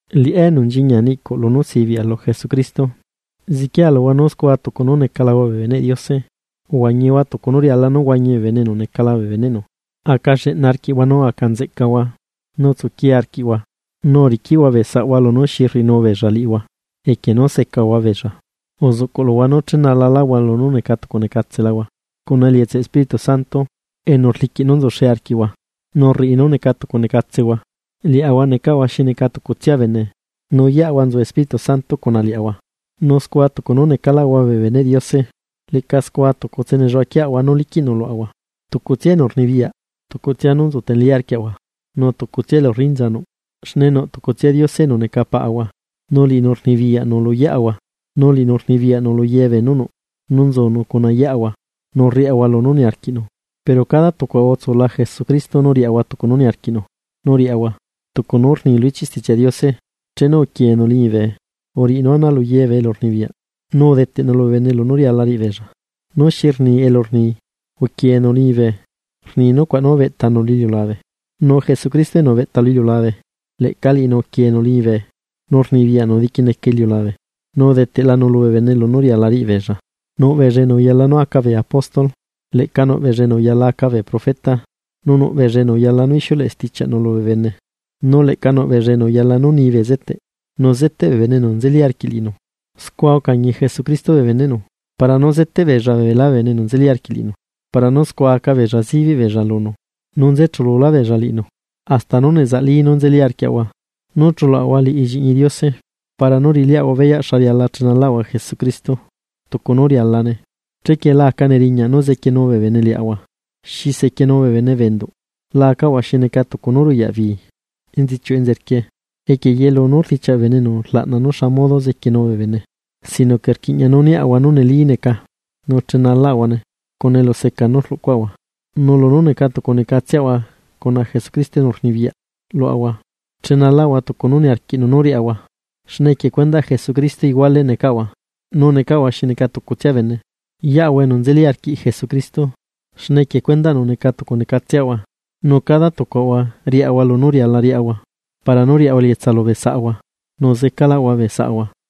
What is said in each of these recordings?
Liꞌá enu nchiñia niꞌcuꞌ lunú sibiꞌa lu Jesucristo, zequiea luhua nú scua tucu nú necalahua bee beneꞌ Diose, uhuañihua tucu nú riala nú huañi bee bene enu necala bee beneꞌnu. Aca lleꞌna arquiꞌhua nu aca nzeꞌcahua, nu tsuquie arquiꞌhua, nu uriquiꞌhua bee saꞌhua lunú xi rriꞌinu beella liꞌihua, equie nú secahua beella. Uzuꞌcuꞌ luhua nú chenalaláhua nú neca tucu necatsehua cuna elietsaꞌ Espíritu Santo, enu rliquiꞌ nú nzuxe arquiꞌhua, nu rriꞌi nú neca tucu necatsehua. Liaꞌahua necaꞌahua xi neca tucutsia bene, nu yeꞌahua nzu Espíritu Santo cuna liaꞌahua, nu scua tucu nú necalaꞌahua bee beneꞌ Diose leꞌca scua tucutse nelluaꞌaquieꞌahua nú liquiꞌnu luaꞌahua. Tucutsia enu rnibiyaꞌ, tucutsia nú nzutenelí arquiaꞌahua, nu tucutsia elu rrinza nuꞌ, xne nuꞌ tucutsia Diose enu neca Paꞌahua nu liꞌinu rnibiyaꞌnu lu yeꞌahua. Nu liꞌinu rnibiyaꞌnu lu ye beenú nuꞌ, nu nzunu cuna yeꞌahua nu rriaꞌahua lunú niarquiꞌnu. Pero cada tucuaꞌahua utsula Jesucristo nú riaꞌahua tucu nú uniarquiꞌnu nú riaꞌahua. Tucu nú rni lu ichiꞌ Stichiaꞌ Diose: Chenu uquienu liñibe, uriꞌinu ana lu ye bee elurnibiyaꞌ, nu udeteꞌnu lubee bene lunú riala riꞌi beella. Nu, ¿xi rni elu rni nú “uquienu liñibe”? Rni nucuaꞌ nú ubeꞌtanu lu iliulabe. Nu Jesucristo enu ubeꞌta lu iliulabe, leꞌca liꞌinu uquienu liñibe nu rnibiyaꞌnu diquineca iliulabe. Nu udeteꞌlanu lubee bene lunú riala riꞌibeella, nuꞌbeella enu uyala nú aca bee apóstol, leꞌca nuꞌbeella enu uyala aca bee profeta, nu nuꞌ beella enu uyala nú ixiuleꞌe stichiaꞌnu lubee bene, nu leꞌca nuꞌ beella enu uyala nú ni bezeteꞌ nu zeteꞌ bee bene enu nzeli arquiꞌ liꞌinu. Scua ucañi Jesucristo bee beneꞌnu para nú zeteꞌ beella beelá bee bene enu nzeli arquiꞌ liꞌinu para nú scua aca beella zibiꞌ beella lunu, nu nzechululá beella liꞌinu, hasta nú nezaꞌli nú nzeli arquiaꞌahua nú chuluaꞌahua lliꞌñi Diose para nú riꞌiliaꞌahua beyaꞌ xa riala chenalaꞌahua Jesucristo tucu nú rialane. Chequie la aca neriñaꞌ nú zequienu bee bene liaꞌahua xi sequienu bee bene bee enduꞌ, la acaꞌahua xi neca tucu nú ruyaꞌ bii enzichiuꞌ enzerquie equie yelu beenú rdichiaꞌ bee enu rlaꞌna nú xa modo zequienu bee bene. Sino que rquiꞌña nú niaꞌahua nú nelíneca nu chenalaꞌahuane cuna eluseca nú rluꞌcuaꞌahua, nu lunú neca tucunecatseꞌahua cuna Jesucristo enu rnibiyaꞌ luaꞌahua chenalaꞌahua tucu nú niarquiꞌnu nú riaꞌahua. Xne equie cuendaꞌ Jesucristo iguale necaꞌahua nu necaꞌahua xi neca tucutsia bene, yeꞌahua enu nzeli arquiꞌ Jesucristo, xne equie cuendaꞌnu neca tucu necatseꞌahua, nu cada tucuaꞌahua riaꞌahua lunú riala riaꞌahua para nú riaꞌahua elietsa lubee saꞌahua, nu zecaꞌlaꞌahua bee saꞌahua.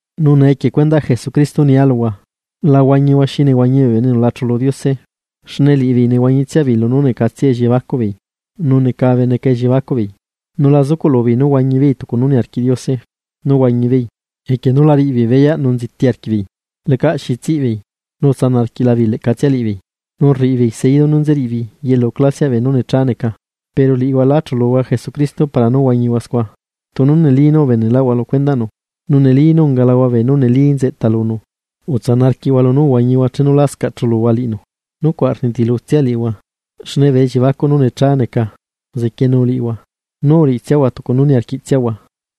Nu nee equie cuendaꞌ Jesucristo nialuhua: La huañihua xi nehuañi bee bene enu la chulu Diose, xne liꞌibeei nehuañitsiabeei lunú necatsia elliebacuꞌbeei nu necabe neca elliebacuꞌbeei. Nu la zucuꞌlubeei nú huañibeei tucu nú niarquiꞌ Diose nú huañibeei, equie nú la riꞌibeei beyaꞌ nu nziti arquiꞌbeei. Lecaꞌ xi zeca beei nu utsanaꞌ arquiꞌlabeei leꞌcatsia liꞌibeei nu rriꞌibeei seidu nú nzeriꞌibeei yelu clasiaꞌ beenú necha neca. Pero liꞌihua lá chuluhua Jesucristo para nú huañihua scua, tunu neli nú ubeneꞌlaꞌhua lu cuendaꞌnu, nu neli nú ungalahua beenú neli neca nzeꞌta lunu. Utsana arquiꞌhua lunú uhuañihua chenu lascaꞌ chuluhua liꞌinu nucuaꞌ rnitilutsia liꞌihua, xne bee elliebacuꞌ nú necha neca uzequienu liꞌihua nu uriꞌitsiahua tucu nú uniarquiꞌtsiahua.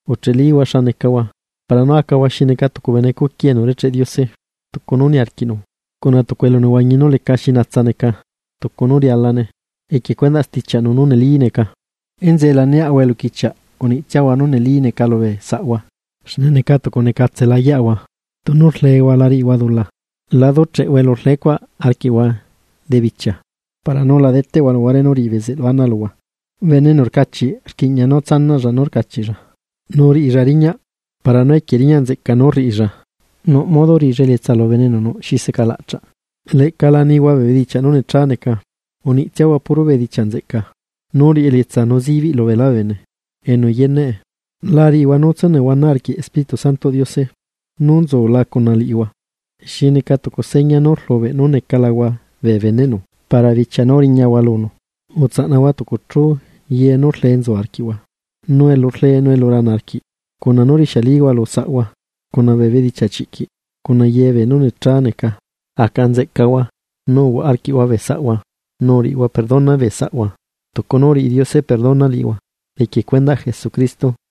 Ucheꞌelihua xa necahua, para nú acahua xi neca tucu bene cuqui enu urecheꞌ Diose tucu nú niarquiꞌnu cuna tucu elunehuañi nú leca nú lixiu neca tucu nú rialane, equie cuendaꞌ stichiaꞌnu nú neli neca. Enzeꞌe la niaꞌhua eluquichiaꞌ, uniꞌtsiahua nú neli neca lubee saꞌhua xne neca tucu necatsela yeꞌahua. Tunu rlehua, la riꞌihua dula. La ducheꞌhua elu rlecuaꞌ arquiꞌhua debichia. Para nú la deteꞌhua luhuare nu riꞌi bezeꞌlu ana luhua. Bene enu rcachiꞌ rquiꞌña nú tsanaꞌlla nú rcachiꞌlla, nu riꞌilla riñaꞌ para nú equie riñaꞌ nzeꞌca nú rriꞌilla nuꞌ modo riꞌilla elietsa lubee bene enu nuꞌ xi secalaꞌchaꞌ. Leꞌca la nihua bee bedichiaꞌ nú necha neca, uniꞌtsiahua puro bedichiaꞌ nzeꞌca nú riꞌi elietsa nu zibiꞌ lu beelá bee bene enu yeneꞌe. La riꞌihua nú tsúnehuana arquiꞌ Espíritu Santoꞌ Diose nú nzula cuna liꞌihua xi neca tucu seña nú rlubeꞌ nú necalahua bee beneꞌnu para bichia nú riñahua lunu. Utsaꞌnahua tucu chu ye nú rlee nzu arquiꞌhua, nu elu rlee, nu elu rana arquiꞌ, cuna nú rixialihua lu saꞌhua, cuna bee bedichiaꞌ chiꞌquiꞌ, cuna ye beenú necha neca. Aca nzeꞌcahua, nu uhuaꞌa arquiꞌhua bee saꞌhua nu uriꞌihua perdona bee saꞌhua tucu nú uriꞌi Diose perdona liꞌihua equie cuendaꞌ Jesucristo.